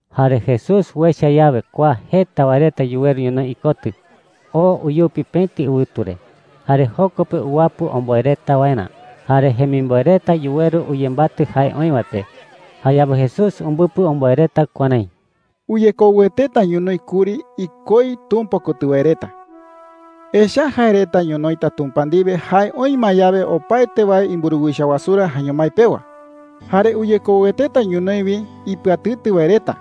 Jare Jesús uecha yawe kua jeta wae reta yuweru ñonoï ikotɨ, oo uyupi pëti ɨwɨtu re. Jare joko pe uwapɨ omboe reta waerä. Jare jemimboe reta yuweru uyembatɨ jae oï wae pe. Jayawe Jesús umbɨpɨ omboe reta kuärái: “Uyekoueteta ñonoï kuri ikoi Tumpa kotɨ wae reta. Echa’ä jae reta ñonoïta Tumpa ndiwe jae oï ma yawe opaete wae imburuwicha wasurä jaeño mái pewa. Jare uyekoueteta ñonoï wi ipɨatɨtɨ wae reta.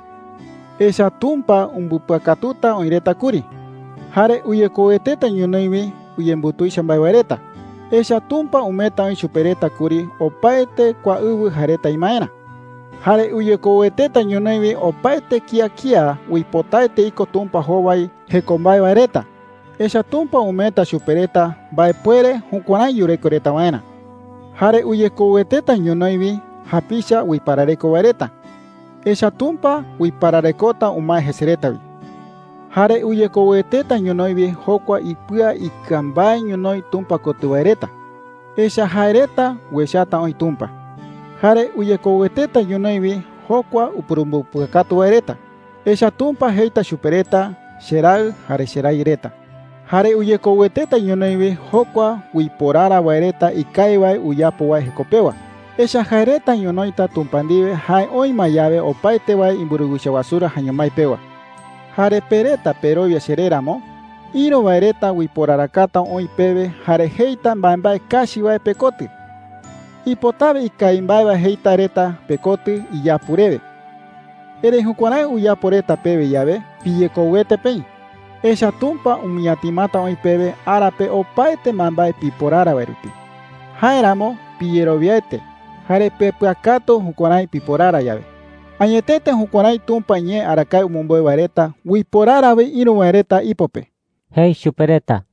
Echa’ä Tumpa umbɨpɨakatuta oï reta kuri. Jare uyekoueteta ñonoï wi uyembutuicha mbae wae reta. Echa’ä Tumpa umeeta oï chupe reta kuri opaete kua ɨwɨ jae reta imaerä. Jare uyekoueteta ñonoï wi opaete kía kía uipotaete iko Tumpa jowai jeko mbae wae reta. Echa’ä Tumpa umeeta chupe reta mbaepuere jukuärái yureko reta waerä. Jare uyekoueteta ñonoï wi japicha uiparareko wae reta. Echa’ä Tumpa uipararekota umae jese reta wi. Jare uyekoueteta ñonoï wi jokua ipɨa ikɨa mbae ñonoï Tumpa kotɨ wae reta. Echa’ä jae reta uechata oï Tumpa. Jare uyekoueteta ñonoï wi jokua upurumbɨpɨakatu wae reta. Echa’ä Tumpa jeita chupe reta: ‘Cheraɨ jare cherayɨ reta.’ Jare uyekoueteta ñonoï wi jokua uiporara wae reta ikawi wae uyapo wae jeko pewa. Echa’ä jae reta ñonoïta Tumpa ndiwe jae oï ma yawe opaete wae imburuwicha wasurä jaeño mái pewa.” “Jare pe reta perowia cheré ramo, ïru wae reta uiporarakata oï pewe jare jeita mbaembae kachi wae pekotɨ. Ipotawe ikawi mbae wae jeita reta pekotɨ iyapu rewe. Erëi jukuärái uyapo reta pewe yawe, piyekouete peï. Echa’ä Tumpa umɨñatimata oï pewe ara pe opaete mbaembae piporara wae rupi. Jáeramo piyerowiaete jare pepɨakatu jukuärái piporara yawe. Añetete jukuärái Tumpa iñee arakae umɨmbeu wae reta uiporara wi ïru wae reta ipo pe,” jei chupe reta.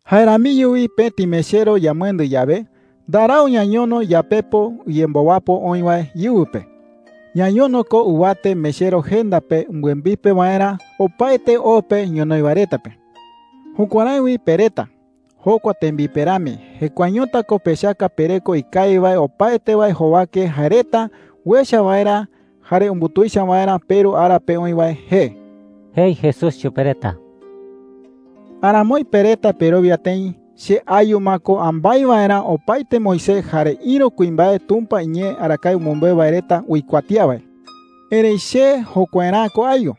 “Jae ramiño wi pëti mechero yamɨendɨ yawe, ndarau ñañono yapepo uyembowapo oï wae íɨwɨ pe. Ñañono ko ɨwate mechero jenda pe umbɨembipe waerä opaete o pe ñonoï wae reta pe,” jei. “Jukuärái wi pe reta, jokua tembipe rami, jekuaeñota ko pechaka pereko ikawi wae opaete wae jowake jae reta uecha waerä jare umbutuicha waerä peRu ara pe oï wae jee,” jei Jesús chupe reta. “Aramoi pe reta perowia tëi che ayu ma ko ambái waerä opaete Moisés jare ïru kuimbae Tumpa iñee arakae umɨmbeu wae reta uikuatía wae. Erëi che jokuaerä'ä ko ayu.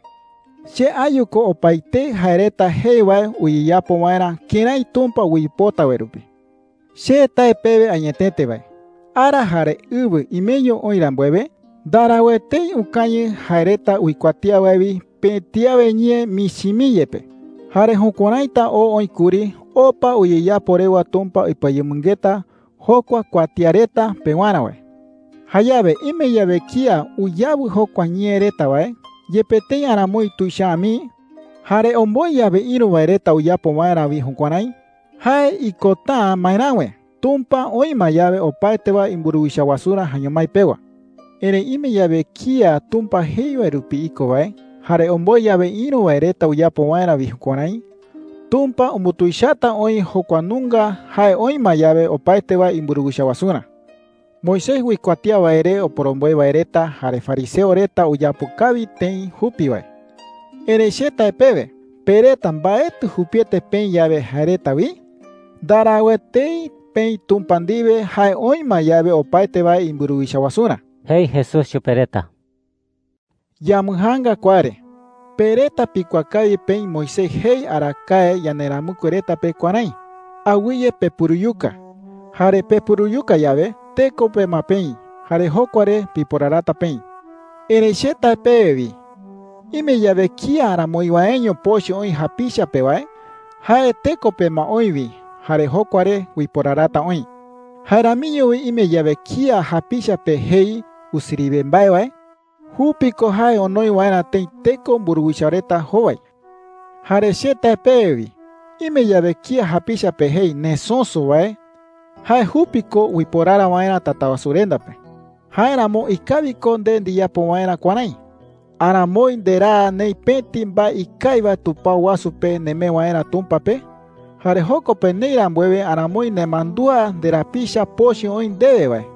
Che ayu ko opaetei jae reta jei wae uyeyapo waerä kërái Tumpa uipota wae rupi,” jei. “Che tae pewe añetete wae, ara jare ɨwɨ imeño oï rambuewe, ndarau etei ukañɨ jae reta uikuatía wae wi pëti awe ñee michi mii yepe. Jare jukuäraita oo oï kuri opa uyeyapo rewa Tumpa ipɨayemɨngeta jokua kuatía reta pewarä wae,” jei. “Jayawe ime yawe kía uyawɨ jokua ñee reta wae, yepe tëi aramoi tuicha’ä mii, jare omboe yawe ïru wae reta uyapo waerä wi jukuärái, jae ikota’ä maeräwe Tumpa oï ma yawe opaete wae imburuwicha wasurä jaeño mái pewa,” jei. “Erëi ime yawe kía Tumpa jei wae rupi iko wae, jare omboe yawe ïru wae reta uyapo waerä wi jukuärái, Tumpa umbutuichata oï jokua nunga jae oï ma yawe opaete wae imburuwicha wasurä,” jei. “Moisés uikuatía wae re oporomboe wae reta jare fariseo reta uyapo kawi tëi jupi wae. Erëi che tae pewe, pe reta mbaetɨ jupiete peï yawe jae reta wi, ndarau etei peï Tumpa ndiwe jae oï ma yawe opaete wae imburuwicha wasurä,” jei Jesús chupe reta. “Yambɨjaanga kua re. Pe reta pikuaa kawi peï Moisés jei arakae yanderamɨkue reta pe kuärái: ‘Awɨye pepuruyuka.’ Jare pepuruyuka yawe, teko pe ma peï jare jokua re piporarata peï,” jei. “Erëi che tae pewe wi, ime yawe kía aramoi waeño pochɨ oï japicha pe wae, jae teko pe ma oï wi jare jokua re uiporarata oï,” jei. “Jae ramiño wi ime yawe kía japicha pe jei, ‘Usiriwe mbae’ wae, jupi ko jae onoi waerä tëi teko mburuwicha reta jowai. Jare che tae pewe wi, ime yawe kía japicha pe jei, ‘Nesöso’ wae, jae jupi ko uiporara waerä Tatawasurenda pe,” jei chupe reta. “Jáeramo ikawi ko nde ndiyapo waerä kuärái: Aramoi nderaa neï pëti mbae ikawi wae tupao wasu pe nemee waerä Tumpa pe. Jare joko pe neï rambuewe aramoi nemandúa nderapicha pochɨ oï ndewe wae.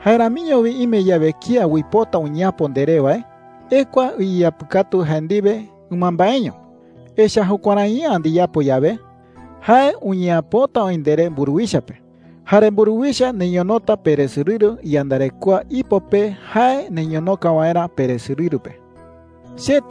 “Jae ramiño wi ime yawe kía uipota uñeapo nderé wae, ekua iyeapɨkatu jae ndiwe ɨmambaeño. Echa’ä jukuärai’ä ndiyapo yawe, jae uñeapota oï nderé mburuwicha pe, jare mburuwicha neñonota peresorɨru iyandarekoa ipo pe jae neñonoka waerä peresorɨru pe,” jei.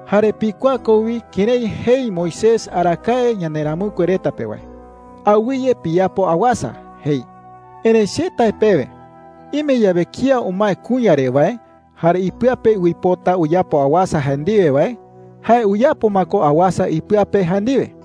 “Jare pikuaa ko wi kërái jei Moisés arakae yanderamɨkue reta pe wae: ‘Awɨye piyapo awasa,’ jei. Erëi che tae pewe, ime yawe kía umae kuña re wae, jare ipɨa pe uipota uyapo awasa jae ndiwe wae, jae uyapo ma ko awasa ipɨa pe jae ndiwe,” jei.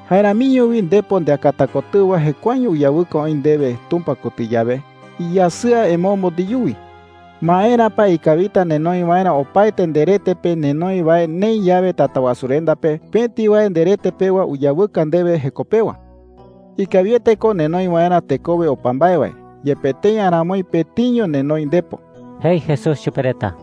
“Jae ramiño wi ndepo ndeakata kotɨwa jekuaeño uyawɨka oï ndewe Tumpa kotɨ yawe, iyasɨa emombo ndeyuwi. ¿Maera pa ikawita nenoi waerä opaete nderete pe nenoi wae neï yawe Tatawasurenda pe pëti wae nderete pewa uyawɨka ndewe jeko pewa? Ikawiete ko nenoi waerä tekowe opa mbae wae, yepe tëi aramoi pëtiño nenoi ndepo,” jei Jesús chupe reta.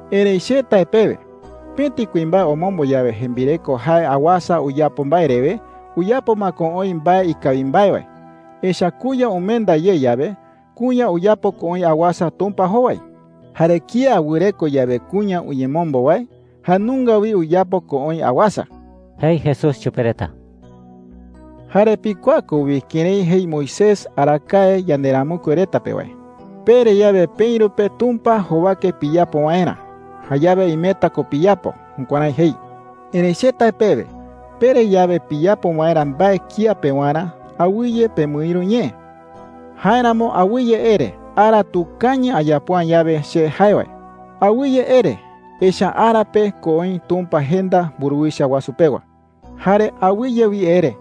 “Erëi che tae pewe, pëti kuimbae omombo yawe jembireko jae awasa uyapo mbae rewe, uyapo ma ko oï mbae ikawi mbae wae. Echa’ä kuña umenda ye yawe, kuña uyapo ko oï awasa Tumpa jowai. Jare kía wɨreko yawe kuña uyemombo wae, jae nunga wi uyapo ko oï awasa,” jei Jesús chupe reta. “Jare pikuaa ko wi kërái jei Moisés arakae yanderamɨkue reta pe wae: ‘Pere yawe peïru pe Tumpa jowake piyapo waerä, jayawe imeta ko piyapo.’ Jukuärái jei. Erëi che tae pewe, pere yawe piyapo waerä mbae kía pewarä, awɨye pemɨïru ñee. Jáeramo awɨye ere: ‘Ara tukañɨ ayapo’ä yawe che jae wae.’ Awɨye ere, echa’ä ara pe ko oï Tumpa jenda mburuwicha wasu pewa,” jei. “Jare awɨye wi ere: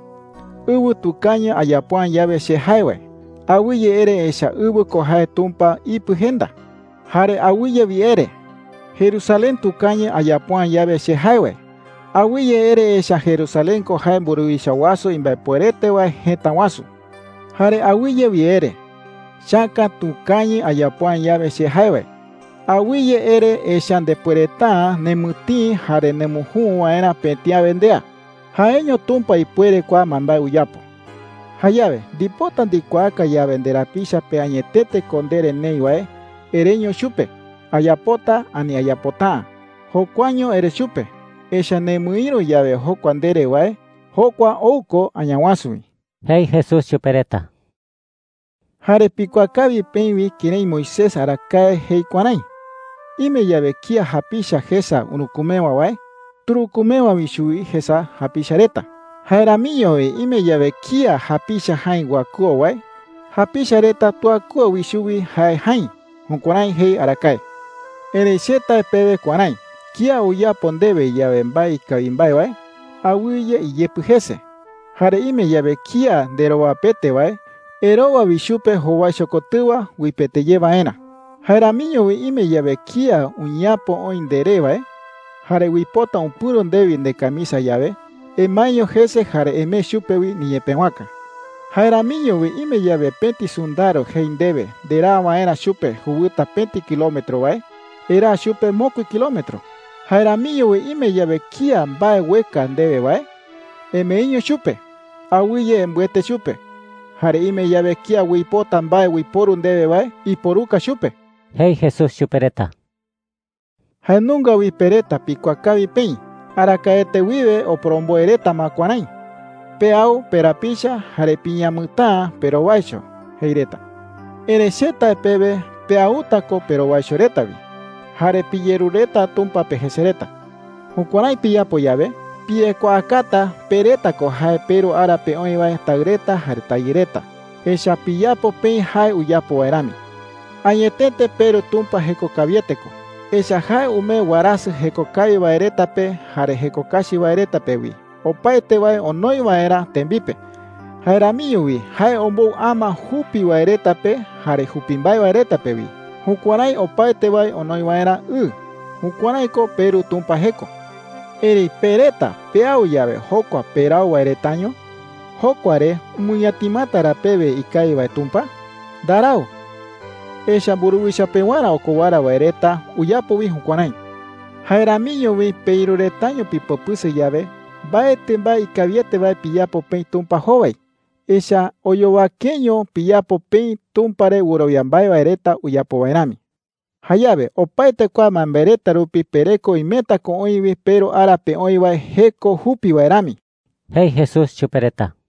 ‘Ɨwɨ tukañɨ ayapo’ä yawe che jae wae.’ Awɨye ere, echa’ä ɨwɨ ko jae Tumpa ipɨ jenda,” jei. “Jare awɨye wi ere: ‘Jerusalén tukañɨ ayapo’ä yawe che jae wae.’ Awɨye ere, echa’ä Jerusalén ko jae mburuwicha wasu imbaepuerete wae jëta wasu,” jei. “Jare awɨye wi ere: ‘Chäka tukañɨ ayapo’ä yawe che jae wae.’ Awɨye ere, echa’ä ndepuereta’ä nemɨtïi jare nemujü waerä pëti awe ndea. Jaeño Tumpa ipuere kua mbaembae uyapo,” jei. “Jayawe ndipota ndikuaaka yawe nderapicha pe añetete ko ndere neï wae, ereño chupe: ‘Ayapota,’ ani ‘Ayapota’ä.’ Jokuaño ere chupe, echa’ä nemɨïru yawe jokua ndere wae, jokua ou ko Añawasu wi,” jei Jesús chupe reta. “Jare pikuaa kawi peï wi kërái Moisés arakae jei kuärái: ‘Ime yawe kía japicha jesa urükumewa wae, turükumewa wi chuwi jesa japicha reta. Jae ramiño wi ime yawe kía japicha jäi uakɨo wae, japicha reta tuakɨo wi chuwi jae jäi.’ Jukuärái jei arakae,” jei. “Erëi che tae pewe kuärái: Kía uyapo ndewe yawe mbae ikawi mbae wae, awɨye iyepɨ jese. Jare ime yawe kía nderowapete wae, erowa wi chupe jowaicho kotɨwa uipete ye waerä,” jei. “Jae ramiño wi ime yawe kía uñeapo oï nderé wae, jare uipota upɨ̈ro ndewi ndecamisa yawe, emaeño jese jare emee chupe wi niñepëwaka,” jei. “Jae ramiño wi ime yawe pëti sɨndaro jei ndewe nderaa waerä chupe jewɨta pëti kilómetro wae, eraa chupe mokui kilómetro,” jei. “Jae ramiño wi ime yawe kía mbae ueka ndewe wae, emeeño chupe. Awɨye embɨete chupe. Jare ime yawe kía uipota mbae uiporu ndewe wae, iporuka chupe,” jei Jesús chupe reta. “Jae nunga wi pe reta pikuaa kawi peï, arakaete wiwe oporomboe reta ma kuärái: ‘Peau perapicha jare piñamɨtäa perowaicho,’ jei reta. Erëi che tae pewe peauta ko perowaicho reta wi. Jare piyerureta Tumpa pe jese reta,” jei. “Jukuärái piyapo yawe, piyekuaakata pe reta ko jae peRu ara pe oï wae taɨ reta jare tayɨ reta, echa’ä piyapo peï jae uyapo wae rami,” jei. “Añetete peRu Tumpa jeko kawiete ko, echa’ä jae umee warasɨ jeko kawi wae reta pe jare jeko kachi wae reta pe wi, opaete wae onoi waerä tembipe. Jae ramiño wi jae ombou ama jupi wae reta pe jare jupi mbae wae reta pe wi, jukuärái opaete wae onoi waerä ɨ. Jukuärái ko peRu Tumpa jeko,” jei. “Erëi pe reta peau yawe jokua perau wae retaño, ¿jokua re umɨñatimata ra pewe ikawi wae Tumpa? Ndarau. Echa’ä mburuwicha pewarä okowara wae reta uyapo wi jukuärái,” jei chupe reta. “Jae ramiño wi peïru retaño pipopɨsɨ yawe, mbaetɨ mbae ikawiete wae piyapo peï Tumpa jowai. Echa’ä oyowakeño piyapo peï Tumpa re wɨrowia mbae wae reta uyapo wae rami,” jei. “Jayawe opaete kua mbaembae reta rupi pereko imeta ko oï wi peRu ara pe oï wae jeko jupi wae rami,” jei Jesús chupe reta.